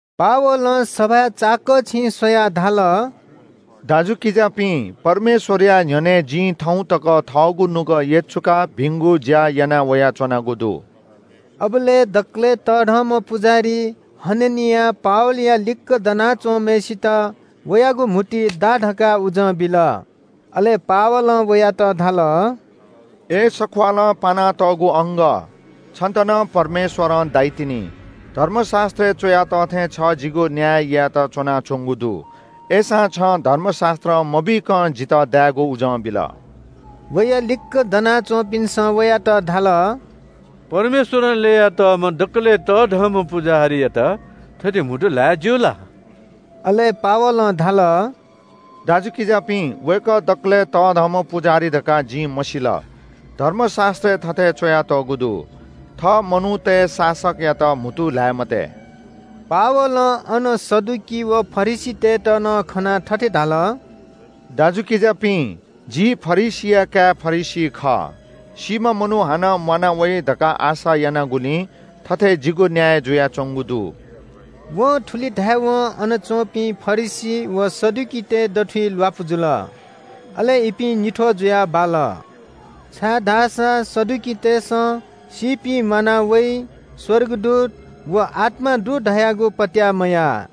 पावलं सभाय् चाकःछिं स्‍वयाः धाल – “दाजुकिजापिं, परमेश्‍वरया न्‍ह्यःने जिं थौं तक थःगु नुगः यचुकाः भिंगु ज्‍या याना वयाच्‍वनागु दु।” अबलय् दकलय् तःधंम्‍ह पुजाहारी हननियां पावलया लिक्‍क दना च्‍वंम्‍हय्‌सित वयागु म्‍हुतुइ दा धकाः उजं बिल। अले पावलं वयात धाल – “अय् सख्‍वालं पानातःगु अंगः, छन्‍त नं परमेश्‍वरं दाइतिनि। धर्मशास्‍त्रय् च्‍वया तः थें छ जिगु न्‍याय यायेत च्‍वनाच्‍वंगु दु। अय्‌सां छं धर्मशास्‍त्रं मबीकं जितः दायेगु उजं बिल।” वया लिक्‍क दना च्‍वंपिन्‍सं वयात धाल – “परमेश्‍वरं ल्‍ययातःम्‍ह दकलय् तःधंम्‍ह पुजाहारीयात थथे म्‍हुतु ल्‍हाये ज्‍यू ला?” अले पावलं धाल – “दाजुकिजापिं, वय्‌कः दकलय् तःधंम्‍ह पुजाहारी धकाः जिं मसिल। धर्मशास्‍त्रय् थथे च्‍वयातःगु दु – ‘थः मनूतय् शासकयात म्‍हुतु ल्‍हाये मते।’” पावलं अन सदुकी व फरिसीतय्‌त नं खनाः थथे धाल – “दाजुकिजापिं, जि फरिसीया काय् फरिसी खः। सीम्‍ह मनू हानं म्‍वाना वइ धकाः आशा यानागुलिं थथे जिगु न्‍याय जुयाच्‍वंगु दु।” वं थुलि धायेवं अन च्‍वंपिं फरिसी व सदुकीतय् दथुइ ल्‍वापु जुल। अले इपिं निथ्‍वः जुयाः बाल, छाय्‌धाःसा सदुकीतय्‌सं सीपिं म्‍वाना वइ, स्‍वर्गदूत व आत्‍मा दु धयागु पत्‍याः मयाः।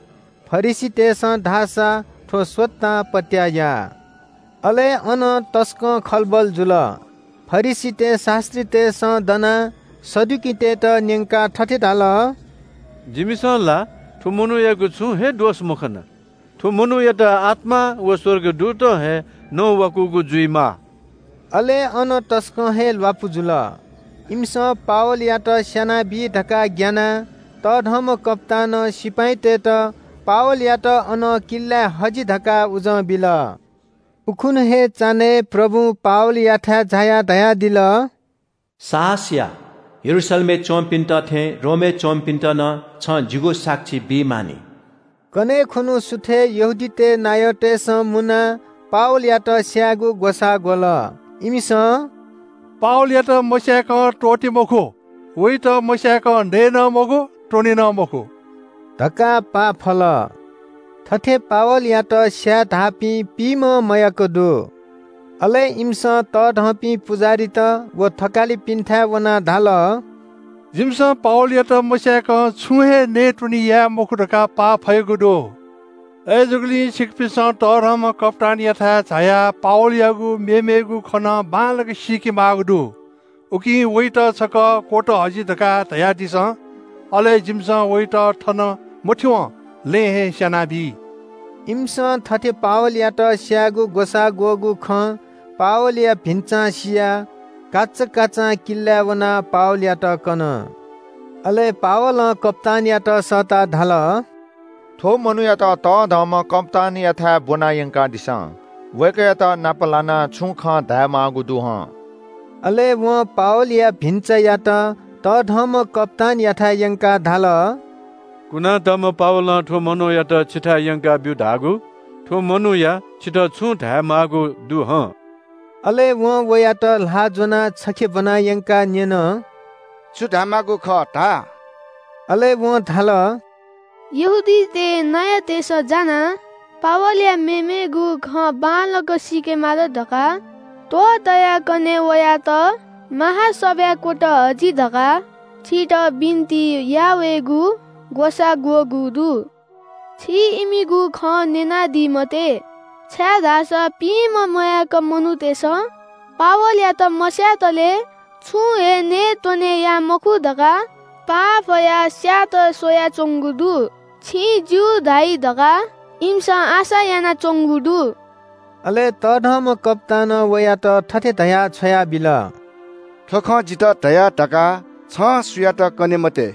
फरिसीतय्‌सं धाःसा थ्‍व स्‍वतां पत्‍याः याः। अले अन तसकं खलबल जुल। फरिसीतय् शास्‍त्रीतय्‌सं दनाः सदुकीतय्‌त न्‍यंकाः थथे धाल – “जिमिसं ला थ्‍व मनूयागु छुं हे दोष मखना। थ्‍व मनूयात आत्‍मां व स्‍वर्गदूतं हे नवाकूगु जुइमाः।” अले अन तसकं हे ल्‍वापु जुल। इमिसं पावलयात स्‍यानाबी धकाः ग्‍यानाः तःधंम्‍ह कप्‍तानं सिपाइँतय्‌त “पावलयात अनं किल्‍लाय् हजि” धकाः उजं बिल। उखुन्‍हु हे चान्‍हय् प्रभुं पावलयाथाय् झायाः धयादिल – “साहस या, यरूशलेमय् च्‍वंपिन्‍त थें रोमय् च्‍वंपिन्‍त नं छं जिगु साक्षी बी मानि।” कन्‍हय् खुन्‍हु सुथय् यहूदीतय् नायःतय्‌सं मुनाः पावलयात स्‍यायेगु ग्‍वसाः ग्‍वल। इमिसं “पावलयात मस्‍यासे त्‍वःते मखु, वयात मस्‍याय्‌कं नये नं मखु, त्‍वने नं मखु” धकाः पाफल। थथे पावलयात स्‍याये धाःपिं पिइम्‍हं मयाक दु। अले इमिसं तःधंपिं पुजाहारीत व थकालिपिन्‍थाय् वनाः धाल – “जिमिसं पावलयात मस्‍याय्‌कं छुं हे नयेत्‍वने याये मखु धकाः पाफयागु दु। अय्‌जूगुलिं छिकपिन्‍सं तःधंम्‍ह कप्‍तानयाथाय् झायाः ‘पावलयागु मेमेगु खँ नं बांलाक सीके माःगु दु, उकिं वयात छकः क्‍वत हजि’ धकाः धयादिसँ। अले जिमिसं वयात थन मथ्‍यंवं लँय् हे स्‍यानाबी।” इमिसं थथे पावलयात स्‍यायेगु ग्‍वसाः ग्‍वःगु खँ पावलया भिन्‍चां सियाः काचाकाचां किल्‍लाय् वनाः पावलयात कन। अले पावलं कप्‍तानयात सःताः धाल – “थ्‍व मनूयात तःधंम्‍ह कप्‍तानयाथाय् ब्‍वना यंकादिसँ। वय्‌कःयात नाप लानाः छुं खँ धायेमाःगु दु हं।” अले वं पावलया भिन्‍चायात तःधंम्‍ह कप्‍तानयाथाय् यंकाः धाल – “कुनातःम्‍ह पावलं थ्‍व मनूयात छिथाय् यंकाब्‍यु धाःगु। थ्‍व मनूया छितः छुं धायेमाःगु दु हं।” अले वं वयात ल्‍हाः ज्‍वनाः छखे ब्‍वना यंकाः न्‍यन – “छु धायेमाःगु खः धा?” अले वं धाल – “यहूदीतय् नायःतय्‌सं जानाः पावलया मेमेगु खँ बांलाक सीके माल धकाः त्‍वहः तयाः कन्‍हय् वयात महासभाय् क्‍वत हजि धकाः छितः बिन्‍ति याः वयेगु ग्‍वसाः ग्‍वःगु दु। छिं इमिगु खँ न्‍यनादी मते, छाय्‌धाःसा पिइम्‍हं मयाक मनूतय्‌सं पावलयात मस्‍यातले छुं हे नयेत्‍वने याये मखु धकाः पाफयाः स्‍यायेत स्‍वयाच्‍वंगु दु। छिं ‘ज्‍यू’ धाइ धकाः इमिसं आशा यानाच्‍वंगु दु।” अले तःधंम्‍ह कप्‍तानं वयात थथे धयाः छ्वयाबिल – “थ्‍व खँ जितः धया धकाः छं सुयातं कने मते।”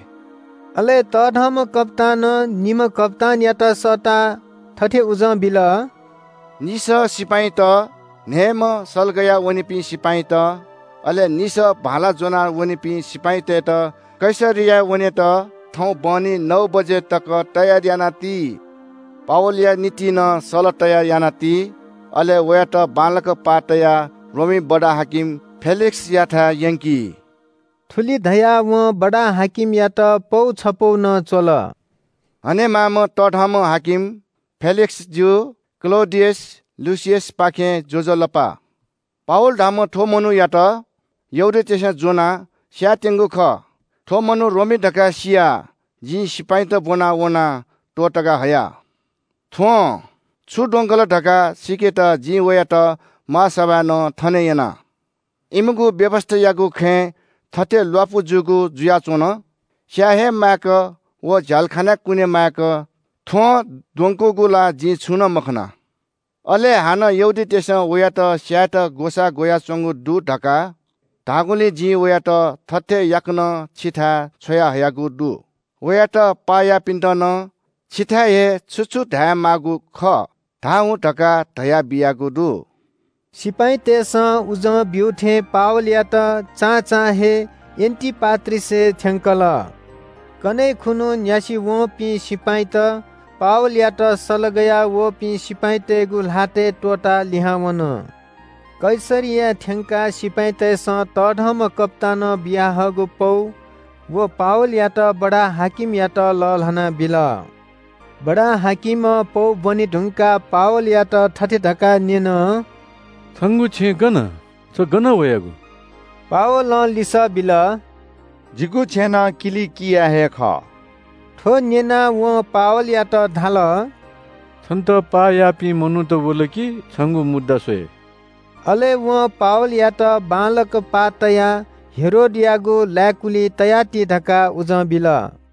अले तःधंम्‍ह कप्‍तानं निम्‍ह कप्‍तानयात सःताः थथे उजं बिल – “निसः सिपाइँत, न्‍हयेम्‍ह सल गया वनीपिं सिपाइँत, अले निसः भाला ज्‍वना वनीपिं सिपाइँतय्‌त कैसरियाय् वनेत थौं बहनी नौ बजे तक तयार याना ति। पावलया निंतिं नं सल तयार याना ति। अले वयात बांलाक पाः तयाः रोमी बडा-हाकिम फेलिक्‍सयाथाय् यंकि।” थुलि धयाः वं बडा-हाकिमयात पौ छपौ नं च्‍वल – “हनेमाःम्‍ह तःधंम्‍ह हाकिम फेलिक्‍सजु, क्‍लौडियस लुसियसपाखें ज्‍वजलपा। “पावल धाःम्‍ह थ्‍व मनूयात यहूदीतय्‌सं ज्‍वनाः स्‍यायेत्‍यंगु खः। थ्‍व मनू रोमी धकाः सियाः जिं सिपाइँत ब्‍वना वनाः त्‍वःतका हया। थ्‍वं छु द्वंकल धकाः सीकेत जिं वयात महासभाय् नं थने यना। इमिगु व्‍यवस्‍थायागु खँय् थथे ल्‍वापु जूगु जुयाच्‍वन। स्‍याये हे माय्‌क व झ्‍यालखानाय् कुने माय्‌क थ्‍वं द्वंकूगु ला जिं छुं नं मखना। अले हानं यहूदीतय्‌सं वयात स्‍यायेत ग्‍वसाः ग्‍वयाच्‍वंगु दु धकाः धाःगुलिं जिं वयात थथे याकनं छिथाय् छ्वयाहयागु दु। वयात पाः याःपिन्‍त नं छिथाय् हे छु छु धायेमाःगु खः धाः हुँ धकाः धयाबियागु दु।” सिपाइँतय्‌सं उजं ब्‍यू थें पावलयात चां चां हे एन्‍टिपाट्रिसय् थ्‍यंकल। कन्‍हय् खुन्‍हु न्‍यासि वंपिं सिपाइँत पावलयात सल गयावःपिं सिपाइँतय्‌गु ल्‍हातय् त्‍वःताः लिहां वन। कैसरियाय् थ्‍यंकाः सिपाइँतय्‌सं तःधंम्‍ह कप्‍तानं बियाहःगु पौ व पावलयात बडा-हाकिमयात लःल्‍हाना बिल। बडा-हाकिमं पौ ब्‍वने धुंकाः पावलयात थथे धकाः न्‍यन – “छंगु छेँ गन, छ गनं वयागु?” पावलं लिसः बिल – “जिगु छेँनं किलिकियाय् हे खः।” थ्‍व न्‍यनाः वं पावलयात धाल – “छन्‍त पाः याःपिं मनूत वल कि छंगु मुद्दा स्‍वये।” अले वं पावलयात बांलाक पाः तयाः हेरोदयागु लाय्‌कुलिइ तयाति धकाः उजं बिल।